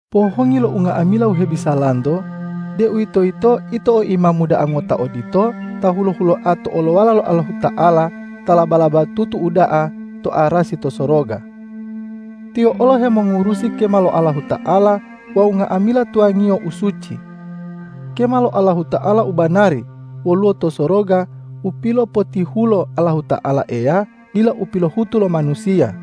Pohongi lo unga'amila u hebisalanto, deuwitoyito ito o Imamu da'a ngota odito ta hulo-huloa to olowala lo Allahuta'ala ta laba-labatutu uda'a to arasi to soroga. Tiyo olo hemongurusi kema lo Allahuta'ala wawu nga'amila tuwangiyo u suci. Kema lo Allahuta'ala u banari woluwo to soroga u pilopotihulo Allahuta'ala Eya dila u pilohutu lo manusiya.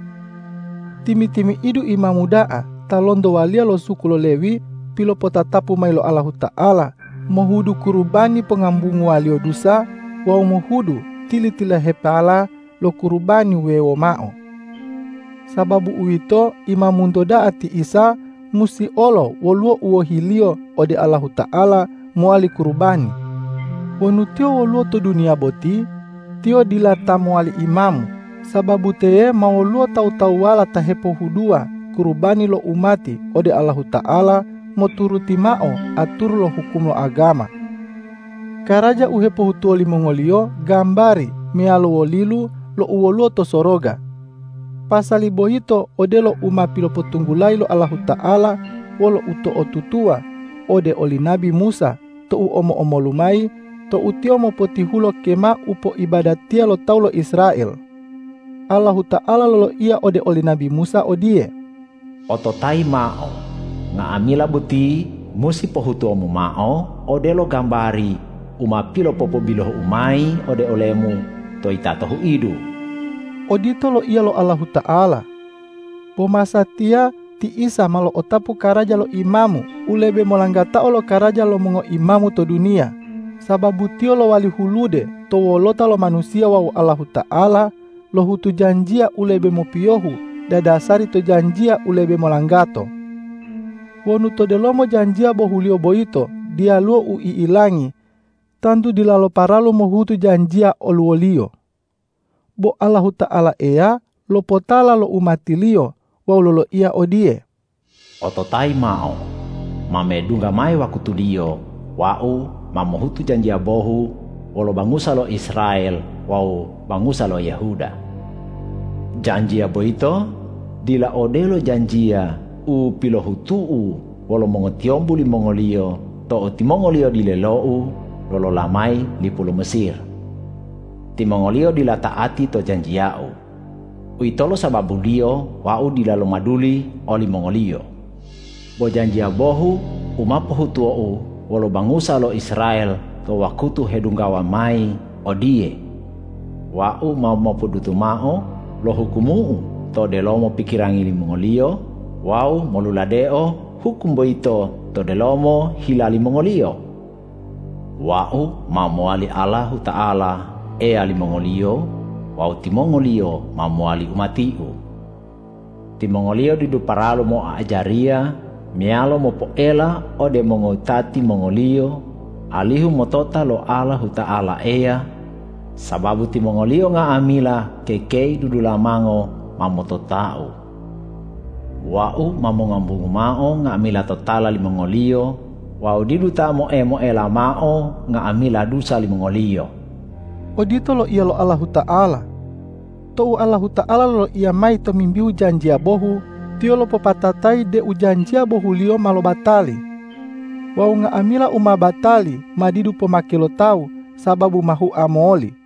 Timi-timi'idu imamu da'a ta lonto waliya lo suku lo Lewi pilopotatapu mayi lo Allahuta'ala, mohudu kurubani pongambunguwa-Liyo dusa wawu mohudu tili-tililahepala lo kurubani wuwewo mao. Sababu uwito, Imamunto da'a ti Isa musi olo woluwo u wohi-Liyo ode Allahuta'ala mowali kurubani. Wonu Tiyo woluwo to duniya boti, Tiyo dila ta mowali imamu, sababu teye ma woluwo tawu-tawuwala ta hepohuduwa kurubani lo umati ode Allahuta'ala moturuti mao aturu lo hukum lo agama. Karaja u hepohutuwo limongoliyo gambari meyalo wolilu lo u woluwo to soroga. Pasali boyito odelo u ma pilopotunggulayi lo Allahuta'ala wolo uto'otutuwa ode oli nabi Musa tou omo-omolu mayi tou tiyo mopotihulo kema u poibadatiya lo tawu lo Israel. Allahuta'ala loloiya ode oli nabi Musa odiye,”Ototayimu mao, nga'amila boti musi pohutuwomu mao odelo gambari u ma pilopobilohu-U mayi olemu to yitato huidu.” Odito loiya lo Allahuta'ala. Bo masatiya ti Isa ma lo'otapu karaja lo imamu u lebe molanggatao lokaraja lo mongoimamu to duniya, sababu Tiyo lowali hulude to wolota lo manusiya wawu Allahuta'ala lohutu janjiya u lebe mopiyohu dadasari to janjiya u lebe molanggato. Wonu to delomo janjiya bohuliyo boyito diyaluwo u i'ilangi, tantu dilalo paralu mohutu janjiya oluwoliyo. Bo Allahuta'ala Eya lopotala lo umati-Liyo wawu loloiya odiye,”Ototayi mao, ma medungga mayi wakutuliyo Wau ma mohutu janjiya bohu wolo bangusa lo Israel wawu bangusa lo Yehuda. Janjiya boyito dila odelo janjiya u pilohutu-U wolo mongotiyombu limongoliyo tou timongoliyo dilelo-U lolola mayi lipu lo Mesir. Timongoliyo dila ta'ati to janjiya-U. Uwitolo sababuliyo Wau dila lomaduli olimongoliyo. Bo janjiya bohu u ma pohutuwo-U wolo bangusa lo Israel to wakutu hedunggawa mayi odiye: Wau ma mopodutu mao lo hukumu-U to delomo pikirangi limongoliyo wawu moluladeo hukum boyito to delomo hila limongoliyo. Wau ma mowali Allahuta'ala Eya limongoliyo wawu timongoliyo ma mowali umati-U. Timongoliyo didu paralu moa'ajariya meyalo mopoela ode mongowutati mongoliyo alihu motota lo Allahuta'ala Eya, sababu timongoliyo nga'amila kekei dudulamango ma motota-U. Wau ma mongambungu mao nga'amila totala limongoliyo wawu didu ta moe-moela mao nga'amila dusa limongoliyo.” Odito loiya lo Allahuta'ala. Tou Allahuta'ala loloiya mayi tomimbihu janjiya bohu, Tiyo lopopatatayi deu janjiya bohuliyo ma lobatali. Wawu nga'amila u ma batali ma didu pomake lo tawu sababu ma hua moli.